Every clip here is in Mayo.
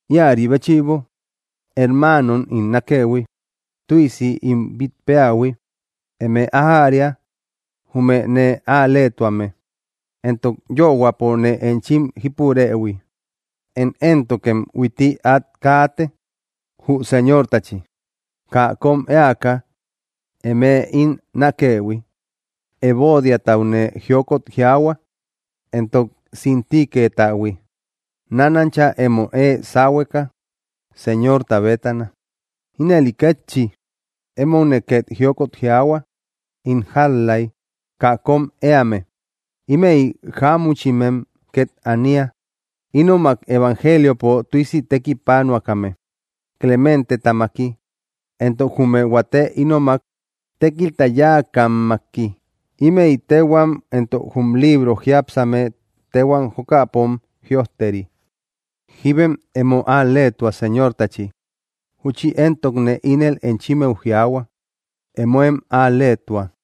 Íäri béchïbo, hermaanom ín nákëhui, tüisi ín bít péähui, ¡eme ájäria jume nee al‑leetuame, entok yöhuäpo nee enchim jípurëhui! Én éntokem huitti át kaate, jü Señortachi, kaa kóm éaka, eme ín nákëhui. Evodiataune jiokot jiaahua, entok Síntiquetahui, nánancha emo ée sáhueka, Señorta bétana. Ínëli kétchi, emoune két jiokot jiaahua, ín jál‑lay kaa kóm éame. Ímëi jámuchimem két ania, ínomak evangeliopo tüisi tekipanuakame, Clementetamaki, entok jume huate ínomak tékilta yáakammaki. Ímëi téhuam éntok jum libro jiápsame téhuam jokäpom jïojteri. Jíbem emo al‑leetua Señortachi. Júchi éntokne ínel enchimmeu jiaahua: ¡Emóem al‑leetua!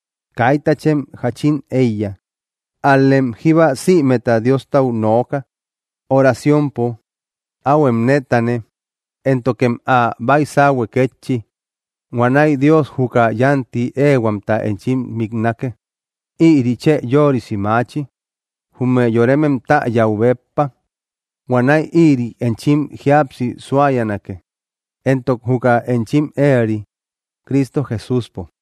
Kaitachem jáchin éiya; ál‑lem jíba sïmeta Diostau nooka, oraciompo. Áhuem nétane, éntokem ä baisauhue kétchi. Huanäi Dios juka yánti éehuamta enchim miknake. Ïri chë yörisi maachi, jume yoremem täyäu béppa. Huanäi ïri enchim jíapsi suayanake, entok juka enchim éeri, Cristo Jesúspo.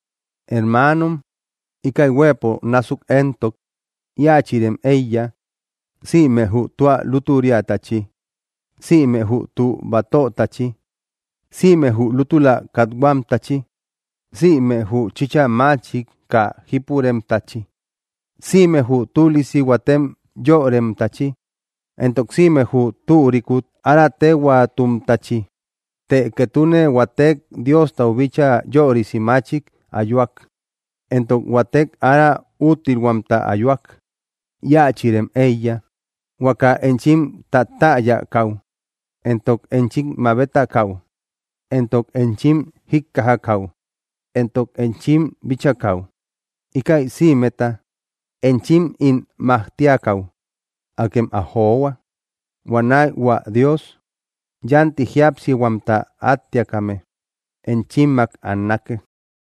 Hermaanom, íkäi huëpo násuk éntok, íachïrem éiya: sïme jü tua lútüriatachi, sïme jü tü batötachi, sïme jü lútula kathuamtachi, sïme jü chïcha machik kaa jípuremtachi, sïme jü tülisi huatem yöremtachi, entok sïme jü türikut ára téhuaatumtachi. Të ketune huatek Diostau bíchaa yörisi machik ayuak, entok huatek ára úttilhuamta ayuak, íachïrem éiya. Huaka enchim tátäyakäu, entok enchim mabetakäu, entok enchim jíkkajakäu, entok enchim bíchakäu, íkäi sïmeta enchim ín majtiakäu, akem ä johua. Huanäi hua Dios yánti jíapsihuamta áttiakame enchimmak annake.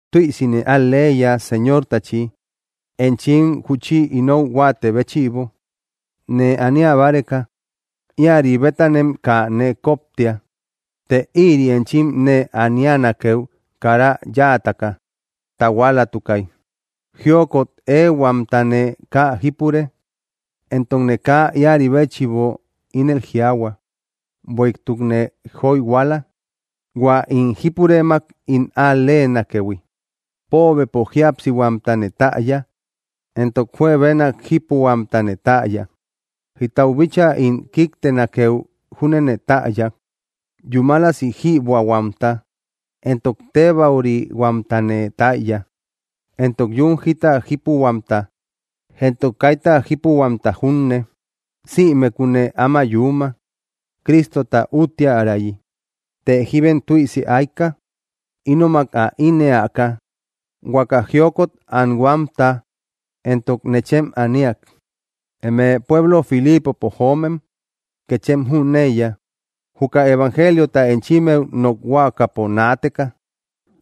Tüisine al‑leiya Señortachi, enchim júchi inou huáatë béchïbo, nee ania báreka. Íäri bétanem kaa nee koptia, të ïri enchim nee anianakeu kara yáataka tahualatukay. Jiokot éehuamtane kaa jípure, entokne kaa íäri béchïbo ínel jiaahua, bueïtukne joyhuala, hua ín jípurëmak ín al‑leenakëhui. Póobepo jíapsihuamtane täya, entok juebenak jípuhuamtane täya. Jítau bíchaa ín kíktenakeu júnene täya. Yúmalasi jïbuähuamta entok tébäurihuamtane täya, entok yún jita jípuhuamta entok kaita jípuhuamta junne. Sïmekune áma yuuma, Cristota úttiärayi. Të jíbem tüisi ayka, ínomak ä ínnëaka huaka jiokot anhuamta entok nechem aniak. Eme pueblo Filipopo joomen kéchem jüneiya, juka evangeliota enchimmeu nokhuakapo naateka,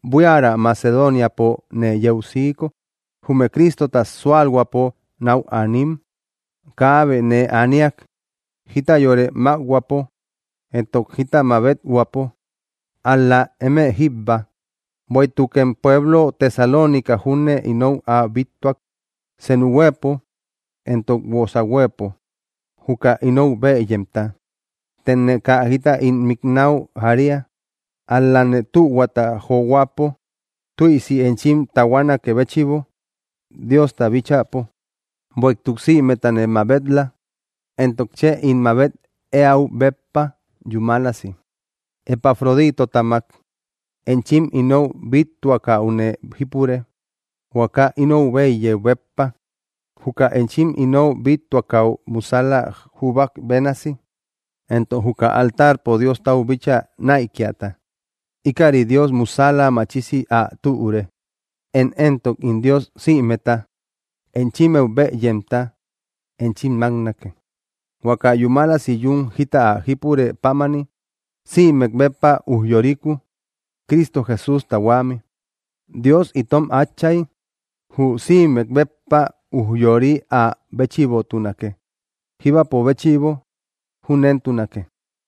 buiarä Macedoniapo nee yeu siiko, jume Cristota súalhuäpo náu aanim kaabe nee aniak, jita yore mákhuäpo entok jita mabet-huäpo, ál‑la eme jíbba. Bueïtukem pueblo Tesalónicau júne inou ä bíttuak, senu huëpo entok guosa huëpo, juka inou bëyemta. Tëne kaa jita ín miknäu jaria; ál‑lane tühuata johuäpo tüisi enchim tahuanakë béchïbo Diosta bíchäpo. Bueïtuk sïmetane mabet‑la, entok chë ín mabet éäu béppa yúmalasi. Epafroditotamak enchim inou bíttuakäune jípure, huaka inou bëyëu béppa, juka enchim inou bíttuakäu musäla juubak bénasi, entok juka altarpo Diostau bíchaa näikiata; íkäri Dios musäla machisi ä türe. Én éntok ín Dios sïmeta enchimmeu bëyemta enchim máknake, huaka yúmalasi yún jita ä jípure pámani, sïmek béppa ujyoriku, Cristo Jesústa huämi. ¡Dios itom Átchay, jü sïmek béppa ujyoori áa béchïbotunake, jíbapo béchïbo! Júnentunake.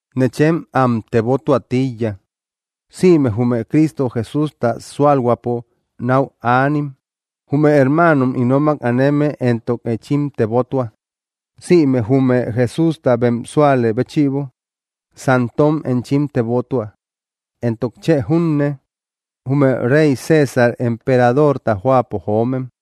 Nechem am tebotuä tíiya, sïme jume Cristo Jesústa súalhuäpo náu aanim. Jume hermaanom ínomak aneme éntok enchim tebotua. Sïme jume Jesústa bem súalë béchïbo santom enchim tebotua, entok chë junne, jume rey César emperadorta jóapo joomem.